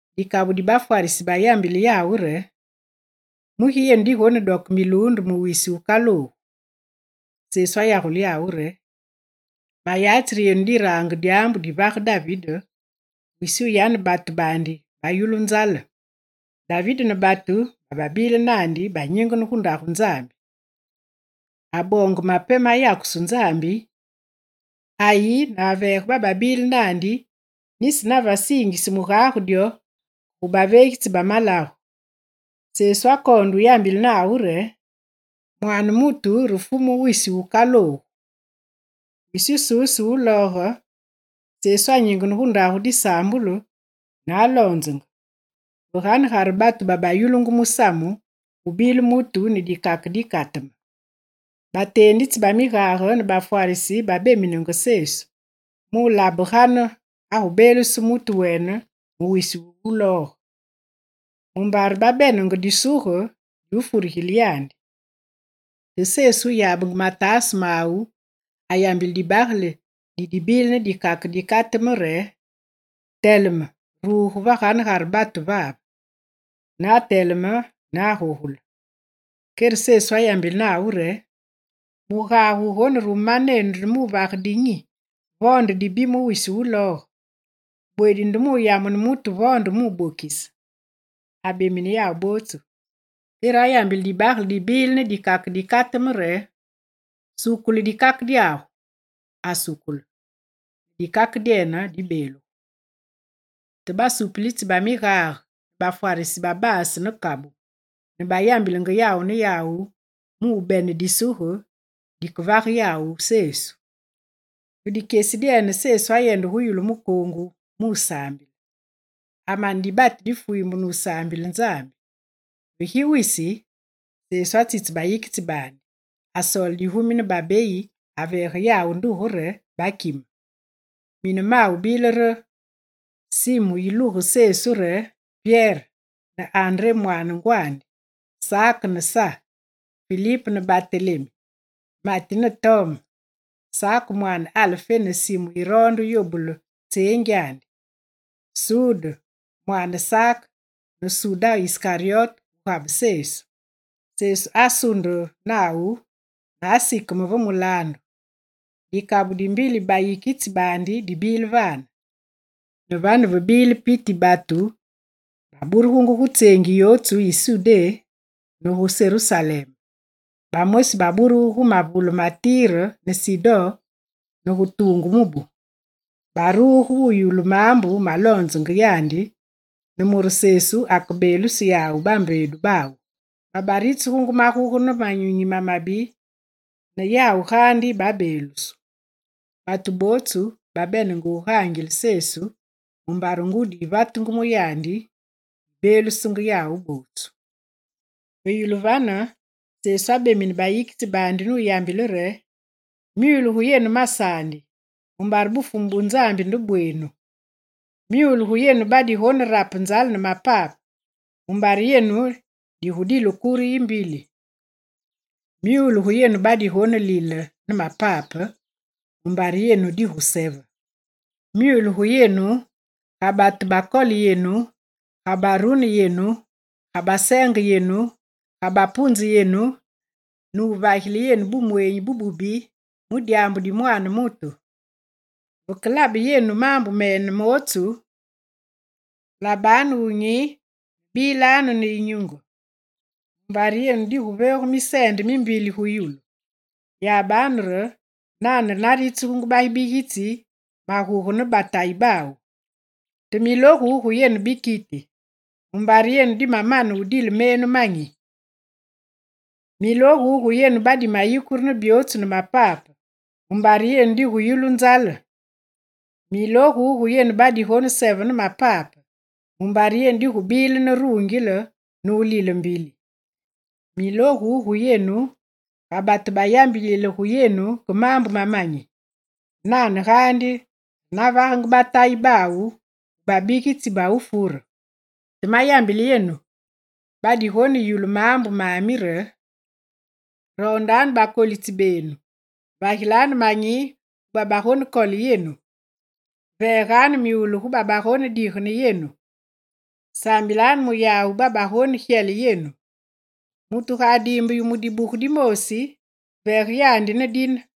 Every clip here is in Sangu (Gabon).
Dikabu di bafwarisi bayambile yawu re: «Mugi yenu digonedoke miluunde mu wisi wukaloogu?» Sesu ayagule yawu re: «Mayatsi re yenu dirange dyaambu divage David, wisi wu yane batu baandi bayulu nzale. David ne batu babile naandi banyingene gu Ndagu Nzambi. Aboonge mape mayakusu Nzambi, ayi ne aveege bababile naandi, nisi nave siingise mugage dyo ke gu baveegitsi ba malagu.» Sesu akoonde wuyambile nawu re: «Mwaane mutu, re Fumu wisi wukaloogu.» Wisi wususu wulooge, Sesu anyingene gu ndagu disaambulu, ne aloonzenge. Ve ganegare batu babayulungu musamu, gubile mutu ne dikake dimabagele dikateme. Bateenditsi ba migage ne bafwarisi babeminenge Sesu, mulabe gane agubeeluse mutu wene mu wisi wulooge, mumbare babenenge disuge di wufurigile yandi. Te Sesu wuyabenge mataase mawu ayambile dibagele dibile ne dikake dikateme re: «Teleme, ruge ve ganegare batu vave.» Ne ateleme ne agogule. Kere Sesu ayambile nawu re: «Mugage wugonerume manenu nde muvage dinyi, vo nde muvage dibi mu wisi wulooge? Bweedi nde muyamune mutu vo nde mubokise?» Abemine yawu bootsu, kere ayambile dibagele dibile ne dikake dikateme re: «Sukule dikake dyagu!» Asukule, ne dikake dyene dibeelugu. Te basupulitsi ba migage ne bafwarisi babasu ne kabu, ne bayambilenge yawu ne yawu mubene disuge dikevage yawu Sesu. Ve dikyesi dyene Sesu ayende gu yulu mukoongu musaambile. Amane dibati difwiimbe nusaambile Nzambi. Ve gi wisi, Sesu atsitse bayikitsi baandi, asoole digumi ne babeyi, aveege yawu nduge re: bakime. Mine mawu bile re: Simu yilugu ne Sesu re Pyere ne André mwaane ngwandi, Sak ne Sa, Filip ne Batelemi, Mati ne Tome, Sak mwaane Alfé ne Simu yiroonde yobule tseengyandi, Sude mwaane Sak ne Suda Iskaryote wugabe Sesu. Sesu asunde nawu ne asikeme ve mulaandu. Dikabu dimbili bayikitsi baandi dibile vane. Ne vane ve bile piti yi batu bababurugu gu tseengi yotsu yi Sudé ne gu Serusalem. Bamosi baburugu gu mavule ma Tire ne Sidon gu tuungu mubu. Baruge muyulu maambu maloonzenge yandi, ne mure Sesu akebeeluse yawu bambeedu bawu. Babaritsugungu maguge ne manyunyi mamabi, ne yawu gaandi babeelusu. Batu bootsu babene wugaangilenge Sesu mumbare ngudi yivatenge mu yandi, yibeelusenge yawu bootsu. Ve yulu vane Sesu abemine bayikitsi baandi nuyambile re: «Myule gu yenu masaandi, mumbare Bufumu bu Nzambi nde bweenu! Myule gu yenu badigonerape nzale ne mapape, mumbare yenu digudile kure yimbili. Myule gu yenu badigonelile ne mapape, mumbare yenu diguseve. Myule gu yenu ga batu bakole yenu, ga barune yenu, ga baseenge yenu, ga bapunze yenu, ne wuvagile yenu bumweenyi bububi mu dyaambu di Mwaane mutu. Veke labenge yenu maambu mene mootsu, labanu wunyi ne bilanu ne yinyunge, mumbare yenu diguveegu miseende mimbili gu yulu. Yabanu re nane re naritsugungu babigitsi maguge ne batayi bawu. Te milogu gu yenu bikiti, mumbare yenu dimamane wudile menu manyi. Milogu gu yenu badimayikure ne byootsu ne mapape, mumbare yenu diguyulu nzale. Milogu gu yenu badigoneseve ne mapape, mumbare yenu digubilenge ne rungile nulile mbili. Milogu gu yenu, ga batu bayambilile gu yenu ke maambu mamanyi. Nane gaandi re navagenge batayi bawu gu babigitsi ba wufure. Te mayambile yenu badigoneyulu maambu mami re: roondanu bakolitsi benu, vagilanu manyi gu babagonekole yenu. Veeganu myule gu yawu babagonedigene yenu. Saambilanu mu yawu babagonegyele yenu. Mutu ga adiimbe yu mu dibuge dimoosi, veege yandi ne dine.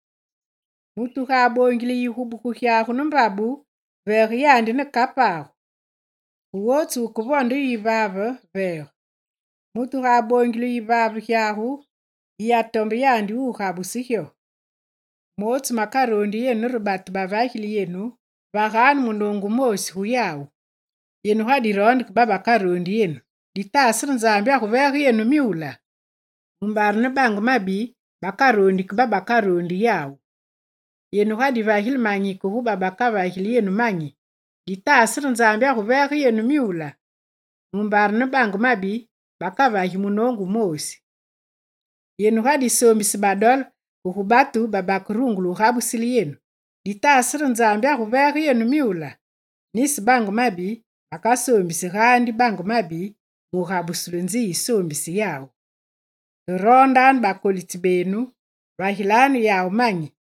Mutu ga aboongile yu yigubuku gyagu ne mbabu, veege yandi ne kapagu. Gu wotsu wukevonde yu yivaave, veege. Mutu ga aboongile yu yivaave gyagu, yiyatombe yandi mu gabuse gyo. Mootsu makaroondi yenu re batu bavagili yenu, vaganu munoongu wumoosi gu yawu. Yenu ga diroonde ke babakaroondi yenu, ditaase re Nzambi aguveege yenu myula? Mumbare ne bange mabi bakaroondi ke babakaroondi yawu. Yenu ga divagile manyi ke gu babakavagili yenu manyi, ditaase re Nzambi aguveege yenu myula? Mumbare ne bange mabi bakavagi munoongu wumoosi. Yenu ga disoombise badole ke gu batu babakerungule wugabusile yenu, ditaase re Nzambi aguveege yenu myula? Nisi bange mabi bakasoombisi gaandi bange mabi mu gabusulu nzi yisoombise yawu. Te roondanu bakolitsi benu, vagilanu yawu manyi.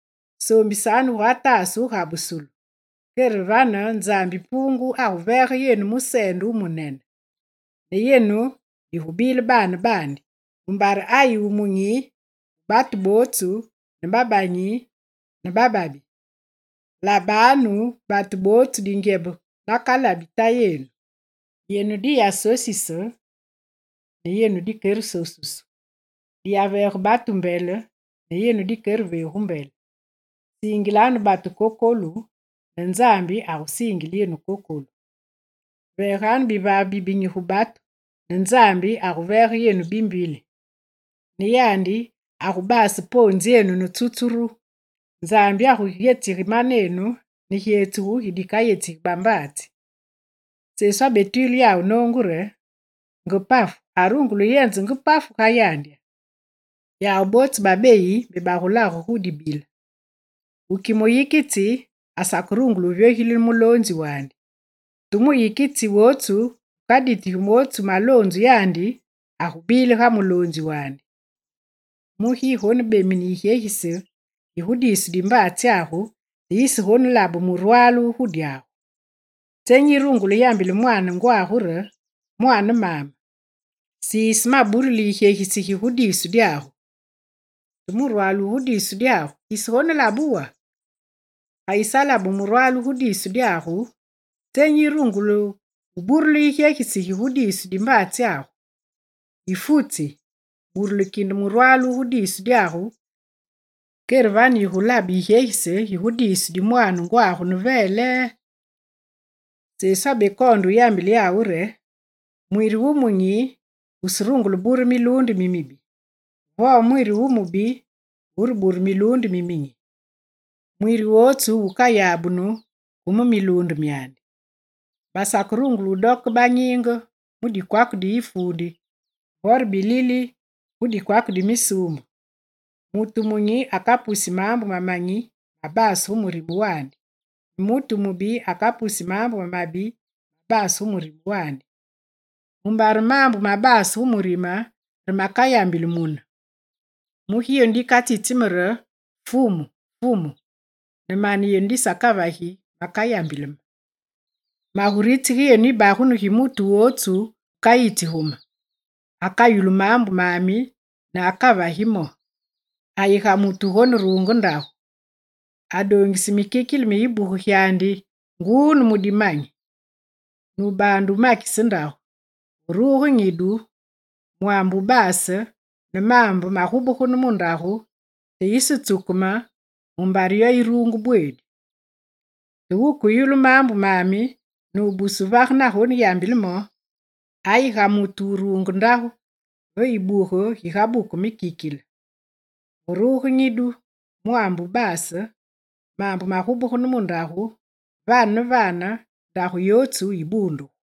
Soombisanu gugataase wugabusulu, kere vane Nzambi Puungu aguveege yenu museende wumunene. Ne yenu digubile baane baandi, mumbare ayi wumunyi gu batu bootsu ne babanyi ne bababi. Labanu batu bootsu dingyebe nakalabi Tayenu. Yenu diyasosise ne yenu dikeresosusu. Diyaveege batu mbele ne yenu dikereveegu mbele. Siingilanu batu kokolu ne Nzambi akesiingile yenu kokolu. Veegenganu bivaave bibinyi gu batu ne Nzambi aguveege yenu bimbili. Ne yandi agubase poonzyenu ne tsutsuru Tsutsuru: bigu Gugare poonzi bivyogilile mubilulu.. Nzambi aguyetsige manenu ne gyetsugu gi dikayetsigi bambaatsi.» Sesu abetwile yawu noongu re: «Nge pafu arungule wuyenze nge pafu ga yandya? Yawu bootsu babeyi mbe bagulage gu dibile. Wuki muyikitsi asakerungule wuvyogilile muloonzi wandi. Te muyikitsi wotsu wumaditige mootsu maloonzu yandi, agubile ga muloonzi wandi. Mugi yigonebemine yigyegise gi gu diisu di mbaatsyagu, te yisegonelabe murwale wu gu dyagu? Tsenyi yirungule yambile mwaane ngwagu re: “Mwaane maame, siise maburuli yigyegise gi gu diisu dyagu”, te murwale wu gu diisu dyagu, yisegonelabe wo? Ga yisalabe murwale wu gu diisu dyagu, tsenyi yigurungule burule yigyegise gi gu diisu di mbaatsyagu? Yifutsi, burule kinde murwale wu gu diisu dyagu, kere vane yigulabe yigyesise gigu diisu di mwaane ngwagu ne velee.» Sesu abekoonde wuyambile yawu re: «Mwiri wumunyi wuserungule wubure miluunde mimibi, vo mwiri wumubi wurebure miluunde miminyi. Mwiri wotsu wukayabunu ke mu miluunde myandi. Basakerungule wudooke banyiinge mu dikwake di ifuundi, vore bilili gu dikwake di misuumbe. Mutu wumunyi akapusi maambu mamanyi mabase gu murime wandi; ne mutu wumubi akapusi maambu mamabi mabase gu murime wandi. Mumbare maambu mabaase gu murime, re makayambili mune. Mugi yenu dikatsitsi me re: “Fumu, Fumu!”, ne mane yenu disakavagi makayambili me? Maguritsige yenu yibagunu gi mutu wotsu wukayitsi gu me: Akayulu maambu mami ne akavagi mo. Ayi ga mutu wugoneruunge ndagu: Adoongise mikikile mi yibuge gyandi nguu ne mu dimanyi, nubaande wumakise ndagu. Ve ruge nyidu, mwaambe wubase ne maambe magubegene mu ndagu, te yisetsukeme, mumbare yo yiruungu bweedi. Te wukeyulu maambu mami, nubuse wuvage na yambile mo, ayi ga mutu wuruunge ndagu ve yibuge gigabuku mikikile, ve ruge nyidu, mwaambe wubaase, maambe magubegene mu ndagu, vane ne vane ndagu yotsu yibuundugu.»